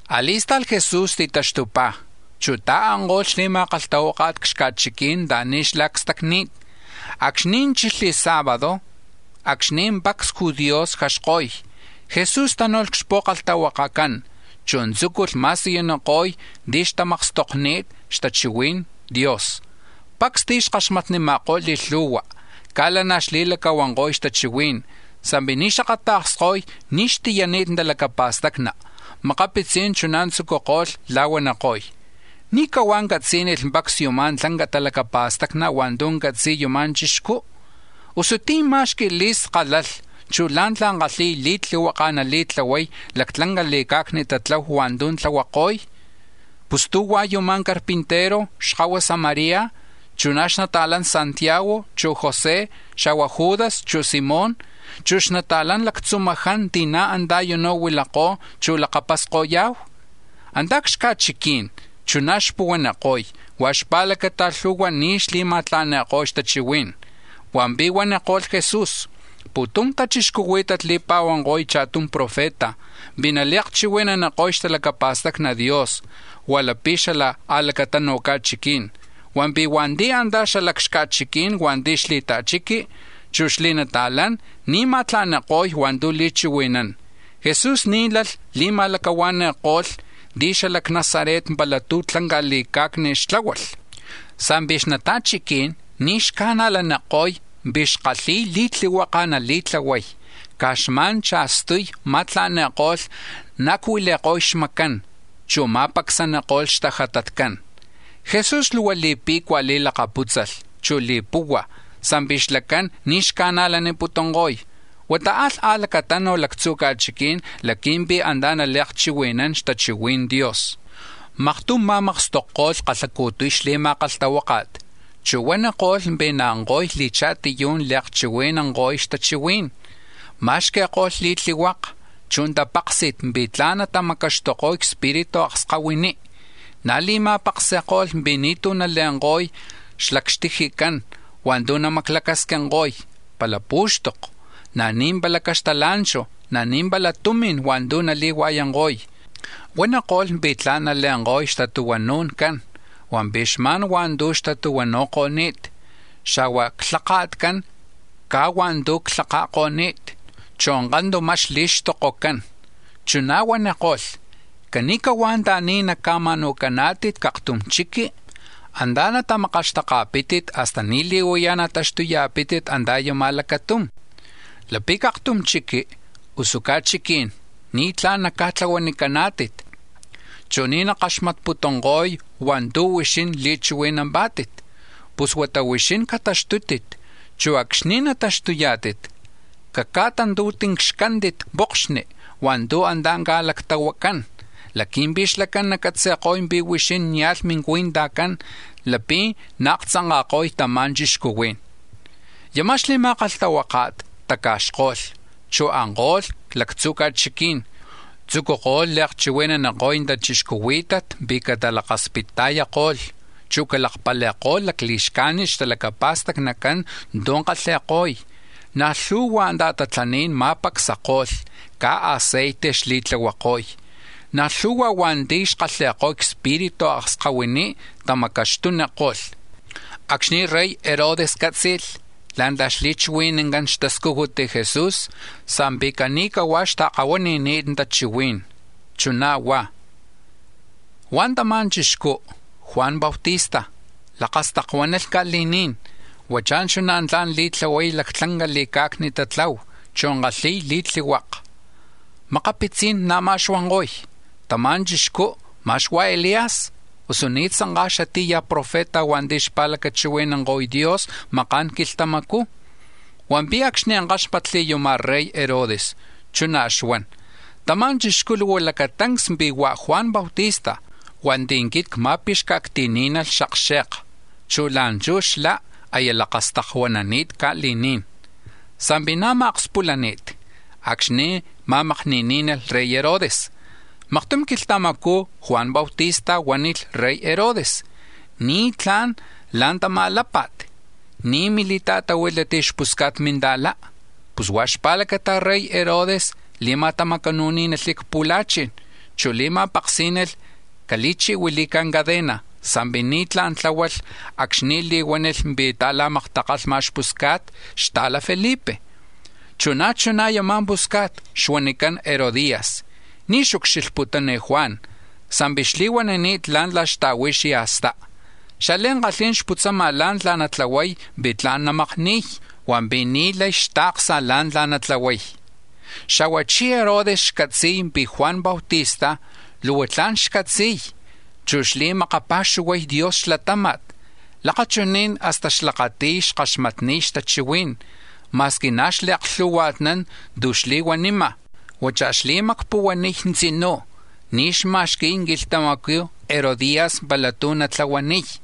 A̱li̱sta̱lh Jesús titaxtupá̱, chu̱ ta̱anko̱lh xli̱ma̱kalhtahuáka̱t c-xca̱chiquí̱n anta̱ni̱ xlá̱ cstacni̱t. Acxni̱ chilh sábado, acxni̱ pacs judíos xjaxko̱y, Jesús tánu̱lh c-xpu̱kalhtahuakacán, chu̱ tzúculh ma̱siyuniko̱y ti̱ xtamakstokko̱ni̱t xtachihui̱n Dios. Pacs ti̱ xkaxmatnima̱kó̱ li̱lhu̱hua, caj lanaj xli̱lacahuanko̱y xtachihuí̱n, sa̱mpi̱ ni̱ xakata̱ksko̱y ní̱ xtiyani̱t talacapa̱stacni. Makapitzí̱n chuná̱ tzúculh la̱huaniko̱y: —¿Ní̱ cahuá̱ catzí̱nilh pacs yuma̱ lanca talacapa̱stacni̱ hua̱ntu̱ catzi̱y yuma̱ chixcú? Usu ¿tí̱ má̱xqui̱lh li̱skálalh, chu̱ la̱ntla̱ kálhi̱lh li̱tlihuaka̱ nali̱tlahuay lactlanca li̱ca̱cni tatlahu hua̱ntu̱ tlahuako̱y? Pus ¿tú̱ hua̱ yumá̱ carpintero, xkahuasa María, chu̱ na̱ xnata̱lán Santiago, chu̱ José, xa̱hua̱ Judas, chu̱ Simón, chu̱ xnata̱lan lactzumaján ti̱ na̱ antá̱ u̱nú̱ huilakó̱, chu̱ lakapasko̱ya̱hu? Antá̱ c-xca̱chiquí̱n chuná̱ xpuhuaniko̱y, huá̱ xpa̱lacata lhu̱hua̱ ni̱ xma̱tla̱ni̱ko̱y xtachihuí̱n. Hua̱mpi̱ huaniko̱lh Jesús: —Pu̱tum tachixcuhuí̱tat li̱pa̱huanko̱y cha̱tum profeta pi̱ nali̱akchihui̱naniko̱y xtalacapa̱stacni Dios hua̱ lapi̱ xala a̱lacatanu̱ ca̱chiquí̱n, hua̱mpi̱ hua̱nti̱ antá̱ xala c-xca̱chiquí̱n hua̱nti̱ xli̱ta̱chiqui, chu̱ xli̱nata̱lán, ni̱ xma̱tla̱ni̱niko̱y hua̱ntu̱ li̱chihui̱nán. Jesús ni̱ lalh li̱ma̱lacahua̱ni̱ko̱lh ti̱ xala c-Nazaret pala tú̱ tlanca li̱ca̱cni xtláhualh, sa̱mpi̱ xnata̱chiquí̱n ni̱ xca̱najlaniko̱y pi̱ xkalhi̱y li̱tlihuaka̱ nali̱tlahuay, caj xma̱n cha̱stuy ma̱tla̱ni̱ko̱lh naacuili̱ko̱y xmacán, chu̱ ma̱pacsaniko̱lh xtajatatcán. Jesús luhua li̱pe̱cua̱ lilakapútzalh, chu̱ li̱puhua̱, sa̱mpi̱ xlacán ni̱ xca̱najlaniputunko̱y. Huata alh a̱lacatanu̱ lactzu̱ ca̱chiquí̱n laqui̱mpi̱ antá̱ nali̱akchihui̱nán xtachihui̱n Dios. Maktum ma̱makstokko̱lh kalhacu̱tuy xli̱ma̱kalhtahuáka̱t, chu̱ huaniko̱lh pi̱ naanko̱y li̱cha̱tiyú̱n li̱akchihui̱nanko̱y xtachihuí̱n. Ma̱xqui̱ko̱lh li̱tlihuaka, chu̱ tapáksi̱t pi̱ tla̱n natamacaxtuko̱y cspiritu akskahuiní. Na̱ li̱ma̱paksi̱ko̱lh pi̱ ni̱tú̱ nale̱nko̱y xala c-xtijicán hua̱ntu̱ namaclacasquinko̱y pala pú̱xtoko, na̱ ni̱ pala caxtala̱nchu̱, na̱ ni̱ pala tumi̱n hua̱ntu̱ nali̱hua̱yanko̱y. Huaniko̱lh pi̱ tla̱n nale̱nko̱y xtatuhuanu̱ncán, hua̱mpi̱ xma̱n hua̱ntu̱ xtatuhuanu̱ko̱ni̱t, xa̱hua̱ xlhaka̱tcán caj hua̱ntu̱ xlhaka̱ko̱ni̱t, chu̱ kantuma xli̱xtokocán. Chuná̱ huaniko̱lh: —Cani̱cahuá̱ anta̱ni̱ naca̱ma̱nu̱caná̱tit c-aktum chiqui, antá̱ natamakaxtaká̱tit hasta ni̱li̱huaya̱ nataxtuya̱pítit antá̱ yama̱ lacatum. Lapi̱ c-aktum chiqui usu ca̱chiquí̱n ni̱tlá̱n naca̱tlahuacaná̱tit, chu̱ ni̱ nakaxmatputunko̱y hua̱ntu̱ huixín li̱chihui̱nampá̱tit, pus huata huixín cataxtútit, chu̱ acxni̱ nataxtuyá̱tit caca̱tantu̱tincxcántit pokxni̱ hua̱ntu̱ antá̱ ca̱lactahuacán laqui̱mpi̱ xlacán nacatzi̱ko̱y pi̱ huixín nia̱lh mincui̱ntajcán lapi̱ naaktzanka̱ko̱y tama̱ chixcuhuí̱n. Yama̱ xli̱ma̱kalhtahuáka̱t taca̱xko̱lh, chu̱ anko̱lh c-lactzu̱ ca̱chiquí̱n, tzucuko̱lh li̱akchihui̱naniko̱y tachixcuhuí̱tat pi̱ catalakaspita̱yako̱lh, chu̱ calakpali̱ko̱lh lacli̱xcajnit xtalacapa̱stacnicán tu̱ kalhi̱ko̱y. Na̱ lhu̱hua ta̱tatlaní̱n ma̱pacsako̱lh, caj aceite xli̱tlahuako̱y, na̱ lhu̱hua̱ hua̱nti̱ xkalhi̱ko̱y cspiritu akskahuiní̱ tamacaxtuniko̱lh. Acxni̱ rey Herodes cátzi̱lh la̱ntla̱ xli̱chihui̱nancán xtascujut Jesús, sa̱mpi̱ cani̱cahuá̱ xta̱kahuani̱ni̱t tachihuí̱n, chuná̱ huá̱: —Hua̱ tama̱ chixcú, Juan Bautista, lakastakuánalh ca̱li̱ní̱n; huachá̱ chuná̱ tla̱n li̱tlahuay lactlanca li̱ca̱cni tatlahu, chu̱ li̱kalhi̱y li̱tlihuaka. Makapitzí̱n na̱má̱ xuanko̱y: —Tama̱ chixcú, ma̱x hua̱ Elías, usu ni̱ tzanká̱ xatí̱ ya̱ profeta hua̱nti̱ xpa̱lacachihui̱nanko̱y Dios maka̱n quilhtamacú̱. Hua̱mpi̱ acxni̱ káxmatli̱ yuma̱ rey Herodes, chuná̱ xuan: —Tama̱ chixcú̱ luhua lacatancs pi̱ hua̱ Juan Bautista hua̱nti̱ quit cma̱pixca̱acti̱ní̱nalh xakxe̱ka, chu̱ la̱nchú̱ xlá̱ aya lakastakuanani̱t ca̱li̱ní̱n. Sa̱mpi̱ na̱má̱ akspulani̱t acxni̱ ma̱makni̱ní̱nalh rey Herodes: Maktum quilhtamacú̱ Juan Bautista huánilh rey Herodes: “Ni̱tlá̱n la̱ntamá̱ lápa̱t, ni̱ mi̱li̱ta̱tahuílat xpusca̱t minta̱lá.” Pus huá̱ xpa̱lacata rey Herodes li̱ma̱tamacanu̱ní̱nalh c-pu̱la̱chi̱n, chu̱ li̱ma̱paksí̱nalh cali̱chi̱huili̱ca̱ cadena, sa̱mpi̱ ni̱tlá̱n tláhualh acxni̱ li̱huánilh pi̱ xta̱la̱maktakalhma̱ xpusca̱t xta̱la Felipe. Chu̱ na̱ chuná̱ yama̱ pusca̱t xuanicán Herodías, ni̱ xucxilhputún Juan sa̱mpi̱ xli̱huanini̱t la̱ntla̱ xta̱hui̱ xya̱stá, xliankalhí̱n xputzama̱ la̱ntla̱ natlahuay pi̱ tla̱n namakni̱y, hua̱mpi̱ ni̱ lay xta̱ksa̱ la̱ntla̱ natlahuay. Xa̱huachí̱ Herodes xcatzi̱y pi̱ Juan Bautista luhua tla̱n xcatzi̱y, chu̱ xli̱makapa̱xuhuay Dios xlatáma̱t. Lakachuní̱n hasta xlakati̱y xkaxmatniy xtachihuí̱n ma̱squi na̱ xli̱aklituanán tu̱ xli̱huanima̱. Huachá̱ xli̱macpuhuaniy tzinú̱, ni̱ xma̱xqui̱y quilhtamacú̱ Herodías pala tu̱ natlahuaniy.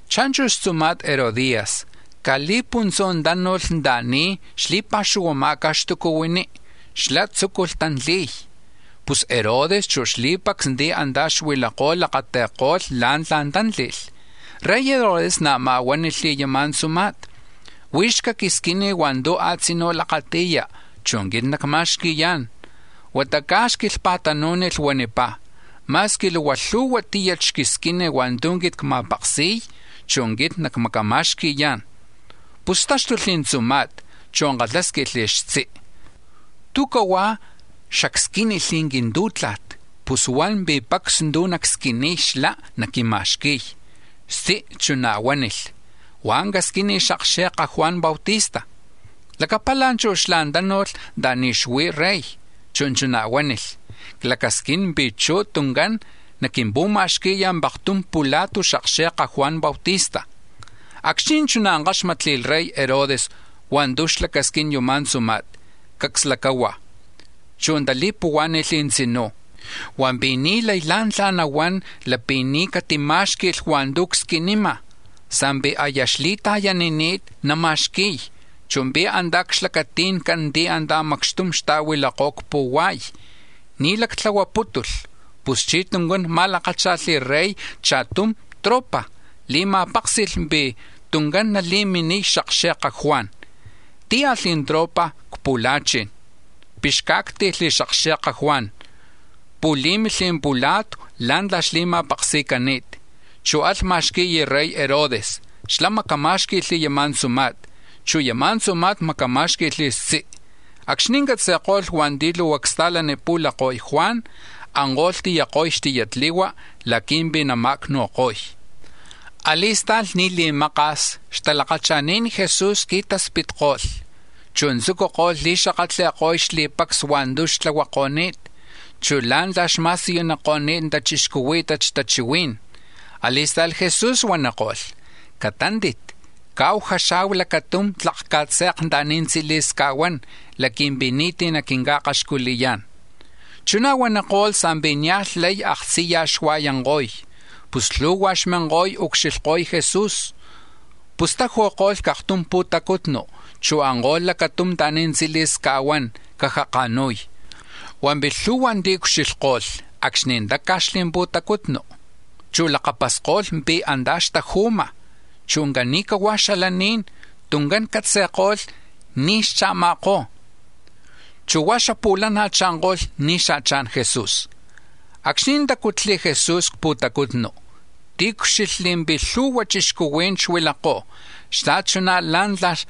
Cha̱nchu̱ xtzuma̱t Herodías caj li̱puntzú̱ tánu̱lh anta̱ni̱ xli̱pa̱xuhuama̱ca̱ xtucuhuiní, xlá̱ tzúculh tantli̱y. Pus Herodes, chu̱ xli̱pacs ti̱ antá̱ xuilakó̱ lakati̱ko̱lh la̱ntla̱ tántli̱lh. Rey Herodes na̱má̱ huánilh yama̱ tzuma̱t: —Huix caquisquini̱ hua̱ntu̱ a̱tzinú̱ lakati̱ya, chu̱ quit nacma̱xqui̱yá̱n. Hasta tlak quilhpa̱tanú̱nilh, huanipá̱: —Ma̱squi luhua lhu̱hua tíyat xquisquini̱ hua̱ntu̱ quit cma̱paksi̱y, chu̱ quit nacmacama̱xqui̱yá̱n. Pus táxtulh tzuma̱t, chu̱ kalhásquilh xtzi: —¿Tú̱ cahuá̱ xacsquínilh quintú̱tla̱t, pus huan pi̱ pacs tu̱ nacsquiniy xlá̱ naquima̱xqui̱y? Xtzi̱ chuná̱ huánilh: —Huá̱ casquini̱ xakxe̱ka̱ Juan Bautista. Lacapala̱ chú̱ xlá̱ tánu̱lh anta̱ni̱ xuí̱ Rey, chu̱ chuná̱ huánilh: —Clacasquín pi̱ chuj tuncán naquimpu̱ma̱xqui̱ paktum pula̱tu̱ xakxe̱ka Juan Bautista. Acxni̱ chuná̱ káxmatli̱ rey Herodes hua̱ntu̱ xlacasquín yuma̱ tzuma̱t, cacs lacahua̱, chu̱ tali̱puhuá̱ni̱lh tzinú̱, hua̱mpi̱ ni̱ lay la̱ntla̱ nahuán lapi̱ ni̱ catimá̱xqui̱lh hua̱ntu̱ csquinima̱, sa̱mpi̱ aya xli̱ta̱yanini̱t nama̱xqui̱y, chu̱ pi̱ na̱ antá̱ c-xlacati̱ncán ti̱ antá̱ macxtum xta̱huilakó̱ c-pu̱hua̱y, ni̱ lactlahuapútulh. Puschí̱ tuncán ma̱lakácha̱lh rey cha̱tum tropa̱, li̱ma̱páksi̱lh pi̱ tuncán nali̱miniy xakxe̱ka Juan. Tíalh tropa̱ c-pu̱la̱chi̱n, pixcá̱acti̱lh xakxe̱ka Juan, pu̱lí̱milh pula̱tu̱ la̱ntla̱ xli̱ma̱paksi̱cani̱t, chu̱ alh ma̱xqui̱y rey Herodes. Xlá̱ macamá̱xqui̱lh yama̱ tzuma̱t, chu̱ yama̱ tzuma̱t macamá̱xqui̱lh xtzi. Acxni̱ catzi̱ko̱lh hua̱nti̱ luhua csta̱lanipu̱lakoy Juan, anko̱lh tiyako̱y xtiyatli̱hua̱ laqui̱mpi̱ nama̱acnu̱ko̱y. A̱li̱sta̱lh, ni̱ li̱maka̱s, xtalakacha̱ni̱n Jesús qui̱taspitko̱lh, chu̱ tzucuko̱lh li̱xakatli̱ko̱y xli̱pacs hua̱ntu̱ xtlahuako̱ni̱t, chu̱ la̱ntla̱ xma̱siyuniko̱ni̱t tachixcuhuí̱tat xtachihuí̱n. A̱li̱sta̱lh Jesús huaniko̱lh: —Catántit, caahu jaxa̱hu lacatum tlak ca̱tze̱k anta̱ni̱ tzili̱s ca̱huán laqui̱mpi̱ ni̱tí̱ naquinca̱akaxculiyá̱n. Chuná̱ huaniko̱lh sa̱mpi̱ nia̱lh lay aktziyaj xua̱yanko̱y, pus lhu̱hua̱ xminko̱y ucxilhko̱y Jesús. Pus ta̱taju̱ko̱lh c-aktum pu̱tacutnu, chu̱ anko̱lh lacatum anta̱ni̱ tzili̱s ca̱huán, caja ka̱nu̱y. Hua̱mpi̱ lhu̱hua̱ tiucxilhko̱lh acxni̱ táca̱xli̱ pu̱tacutnu, chu̱ lakapasko̱lh ti̱ antá̱ xtaju̱ma̱, chu̱ cani̱hua̱ xalaní̱n tuncán catzi̱ko̱lh ni̱ xcha̱ma̱kó̱, chu̱ huá̱ xapu̱lana̱ cha̱nko̱lh ni̱ xa̱chá̱n Jesús. Acxni̱ tácutli̱ Jesús c-pu̱tacutnu, tiucxilhli̱ pi̱ lhu̱hua̱ chixcuhuí̱n xuilakó̱ xta̱chuná̱ la̱ntla̱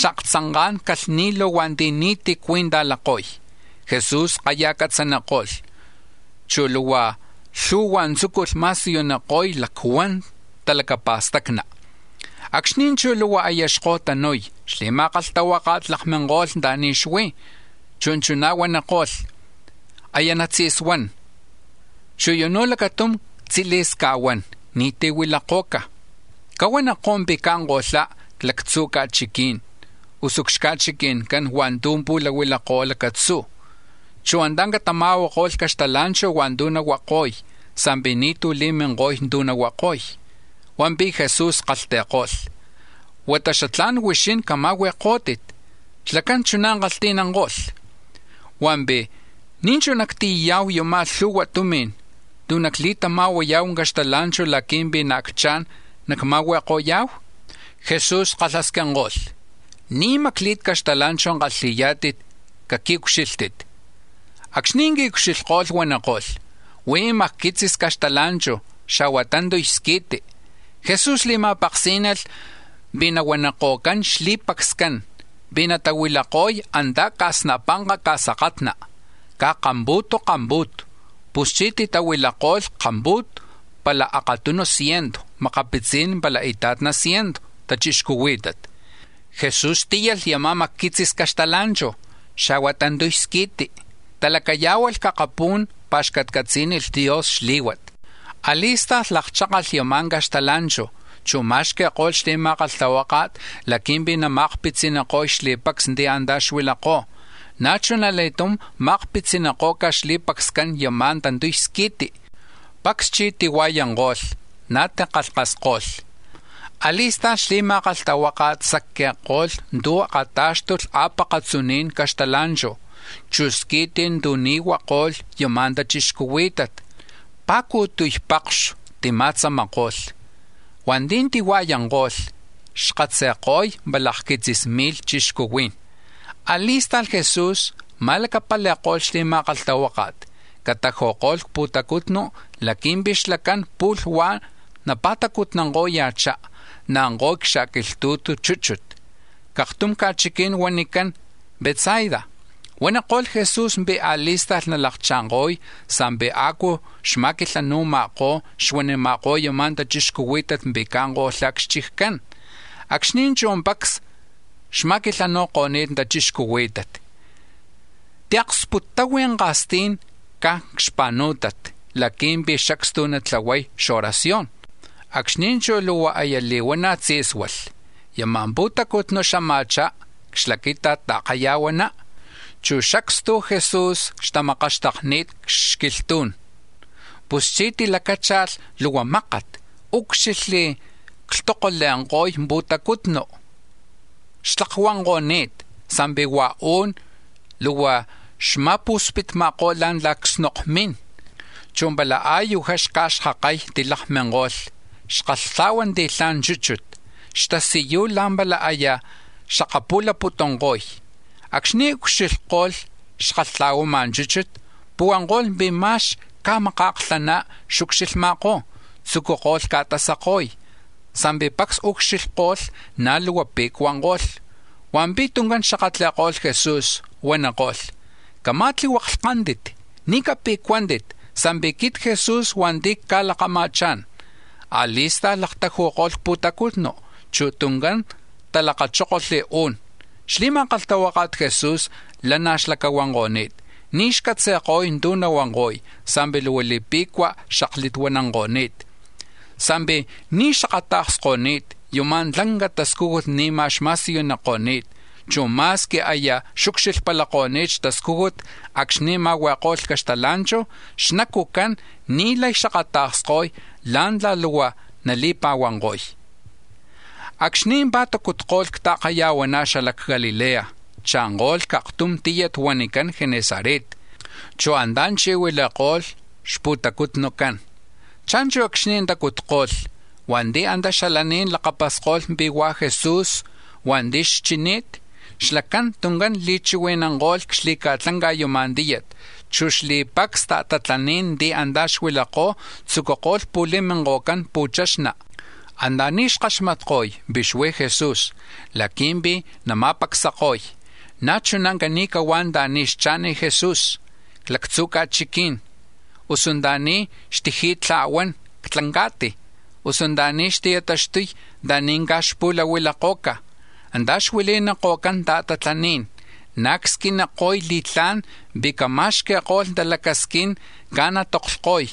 xaaktzanka̱n calhni̱lu̱ hua̱nti̱ ni̱tí̱ cui̱ntajlako̱y. Jesús kayaj catzaniko̱lh, chu̱ lhu̱hua̱ hua̱ntu̱ tzúculh ma̱siyuniko̱y lactla̱n talacapa̱stacni. Acxni̱ chú̱ luhua aya xko̱tanu̱y, xli̱ma̱kalhtahuáka̱t lakminko̱lh anta̱ni̱ xuí̱, chu̱ chuná̱ huaniko̱lh: —Aya natzi̱suán, chu̱ u̱nú̱ lacatum tzili̱s ca̱huán, ni̱tí̱ huilako̱ca̱. Cahuanikó̱ pi̱ caanko̱lhá̱ c-lactzu̱ ca̱chiquí̱n, usu c-xchiccán hua̱nti̱ pu̱lahuilakó̱ lacatzú̱, chu̱ antá̱ catama̱huako̱lh caxtala̱nchu̱ hua̱ntu̱ nahuako̱y sa̱mpi̱ ni̱tú̱ li̱minko̱y tu̱ nahuako̱y. Hua̱mpi̱ Jesús kalhti̱ko̱lh: —Huata xatlá̱n huixín cama̱hui̱kó̱tit. Xlacán chuná̱ kalhti̱nanko̱lh: —Hua̱mpi̱, ¿Ní̱ chú̱ nactiyaya̱hu yama̱ lhu̱hua tumi̱n tu̱ nacli̱tama̱huaya̱hu caxtala̱nchu̱ laqui̱mpi̱ xaacchá̱n nacma̱hui̱ko̱ya̱hu? Jesús kalhasquinko̱lh: —¿Ní̱ macli̱t caxtala̱nchu̱ kalhi̱yá̱tit? Caqui̱ucxílhtit. Acxni̱ qui̱ucxilhko̱lh, huaniko̱lh: —Huí̱ macquitzis caxtala̱nchu̱, xa̱hua̱ tantuy squi̱ti. Jesús li̱ma̱paksí̱nalh pi̱ nahuaniko̱cán xli̱pacscán pi̱ natahuilako̱y antá̱ ca̱snapanka ca̱sakatna, caj kampu̱tu kampu̱tu. Puschí̱ titahuilako̱lh kampu̱tu, pala akatunu ciento, makapitzí̱n pala ita̱tna ciento tachixcuhuí̱tat. Jesús tíyalh yama̱ macquitzis caxtala̱nchu̱, xa̱hua̱ tantuy squi̱ti; talacayá̱hualh c-akapú̱n, pa̱xcatcatzí̱nilh Dios xlí̱huat. A̱li̱sta̱lh lakchákalh yama̱ caxtala̱nchu̱, chu̱ ma̱xqui̱ko̱lh xli̱ma̱kalhtahuáka̱t laqui̱mpi̱ nama̱akpitziniko̱y xli̱pacs ti̱ antá̱ xuilakó̱. Na̱ chuna li̱tum ma̱akpitziniko̱ca̱ xli̱pacscán yama̱ tantuy squi̱ti. Pacs chí̱ tihua̱yanko̱lh, na̱ tikalhkasko̱lh. A̱li̱sta̱lh xli̱ma̱kalhtahuáka̱t sacqui̱ko̱lh tu̱ akatá̱xtulh a̱pakatzuni̱n caxtala̱nchu̱, chu̱ squi̱ti̱ tu̱ ni̱ huako̱lh yama̱ tachixcuhuí̱tat, pa̱cu̱tuy pakxu̱ tima̱tzamako̱lh. Hua̱nti̱ tihua̱yanko̱lh, xkatzi̱ko̱y pala akquitzis mi̱lh chixcuhuí̱n. A̱li̱sta̱lh Jesús ma̱lacapali̱ko̱lh xli̱ma̱kalhtahuáka̱t cataju̱ko̱lh c-pu̱tacutnu̱ laqui̱mpi̱ xlacán pu̱lh huá̱ napa̱tacutnanko̱ya̱chá, naanko̱y c-xa̱li̱quilhtu̱tu chúchut, c-aktum ca̱chiquí̱n huanicán Betsaida; huaniko̱lh Jesús pi̱ a̱li̱sta̱lh nalakcha̱nko̱y sa̱mpi̱ a̱cu xma̱quilhanu̱ma̱kó̱, xuanima̱kó̱ yama̱ tachixcuhuí̱tat pi̱ caanko̱lhá̱ c-xchiccán. Acxni̱ chú̱ pacs xma̱quilhanu̱ko̱ni̱t tachixcuhuí̱tat, tiaksputtahui̱ ka̱stí̱n caj c-xpa̱nú̱tat laqui̱mpi̱ xacstu natlahuay oración. Acxni̱ chú̱ luhua aya li̱huana̱ tzí̱sualh, yama̱ pu̱tacutnu̱ xama̱chá c-xlaquita̱t ta̱kaya̱huaná, chu̱ xacstu Jesús xtamakaxtakni̱t c-xquilhtú̱n. Puschí̱ tilacácha̱lh luhua mákat, úcxilhli̱ clhtokole̱nko̱y pu̱tacutnu. Xtlakuanko̱ni̱t, sa̱mpi̱ hua̱ u̱n, luhua xma̱pu̱spitma̱kó̱ la̱ntla̱ csnokmín. Chu pala a̱yujá xca̱xkakay tilakminko̱lh, xkalhtla̱hua̱nti̱lhama̱ chúchut; xtasiyuy la̱mpala aya xakapu̱laputunko̱y. Acxni̱ ucxilhko̱lh xakatla̱huama̱ chúchut, puhuanko̱lh pi̱ ma̱x caj maka̱klhaná̱ xucxilhma̱kó̱, tzucuko̱lh ca̱tasako̱y, sa̱mpi̱ pacs ucxilhko̱lh, na̱ luhua pe̱cuanko̱lh. Hua̱mpi̱ tuncán xakatli̱ko̱lh Jesús, huaniko̱lh: —Cama̱tlihuaklhcántit, ni̱ cape̱cuántit; sa̱mpi̱ quit Jesús hua̱nti̱ cca̱lakama̱chá̱n. A̱li̱sta̱lh laktaju̱ko̱lh c-pu̱tacutnu, chu̱ tuncán talakachókolh u̱n. Xli̱ma̱kalhtahuaka̱t Jesús lanaj xlacahuanko̱ni̱t, ni̱ xcatzi̱ko̱y tu̱ nahuanko̱y sa̱mpi̱ luhua li̱pe̱cua̱ xaklituananko̱ni̱t, sa̱mpi̱ ni̱ xakata̱ksko̱ni̱t yama̱ tlanca tascújut ni̱ma̱ xma̱siyuniko̱ni̱t, chu̱ ma̱squi aya xucxilhpalakoni̱t xtascújut acxni̱ ma̱hui̱ko̱lh caxtala̱nchu̱, xnacu̱cán ni̱ lay xakata̱ksko̱y la̱ntla̱ luhua nali̱pa̱huanko̱y. Acxni̱ pa̱tacutko̱lh ta̱kaya̱huaná xala c-Galilea, chanko̱lh c-aktum tíyat huanicán Genesaret, chu̱ antá̱ chi̱huili̱ko̱lh xpu̱tacutnucán. Cha̱nchu̱ acxni̱ tacutko̱lh, hua̱nti̱ antá̱ xalaní̱n lakapasko̱lh pi̱ hua̱ Jesús hua̱nti̱ xchini̱t, xlacán tuncán li̱chihui̱nanko̱lh c-xli̱ca̱tlanca yama̱ tíyat, chu̱ xli̱pacs ta̱tatlaní̱n ti̱ antá̱ xuilakó̱ tzucuko̱lh pu̱li̱minko̱cán pu̱chaxna̱ anta̱ni̱ xkaxmatko̱y pi̱ xuí̱ Jesús laqui̱mpi̱ nama̱pacsako̱y. Na̱ chuná̱ cani̱cahuá̱ anta̱ni̱ xcha̱n Jesús, c-lactzu̱ ca̱chiquí̱n, usu anta̱ni̱ xtiji̱tla̱huán c-tlanca̱ti̱, usu anta̱ni̱ xti̱taxtuy anta̱ni̱ caj pu̱lahuilako̱ca̱, antá̱ xuili̱ko̱cán ta̱tatlaní̱n; na̱ csquiniko̱y li̱tlá̱n pi̱ cama̱xqui̱ko̱lh talacasquín caj natoklhko̱y,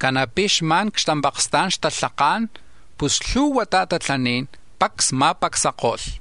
ca̱na̱ pi̱ xma̱n c-xtampaksta̱n xtalhaká̱n; pus lhu̱hua̱ ta̱tatlaní̱n pacs ma̱pacsako̱lh.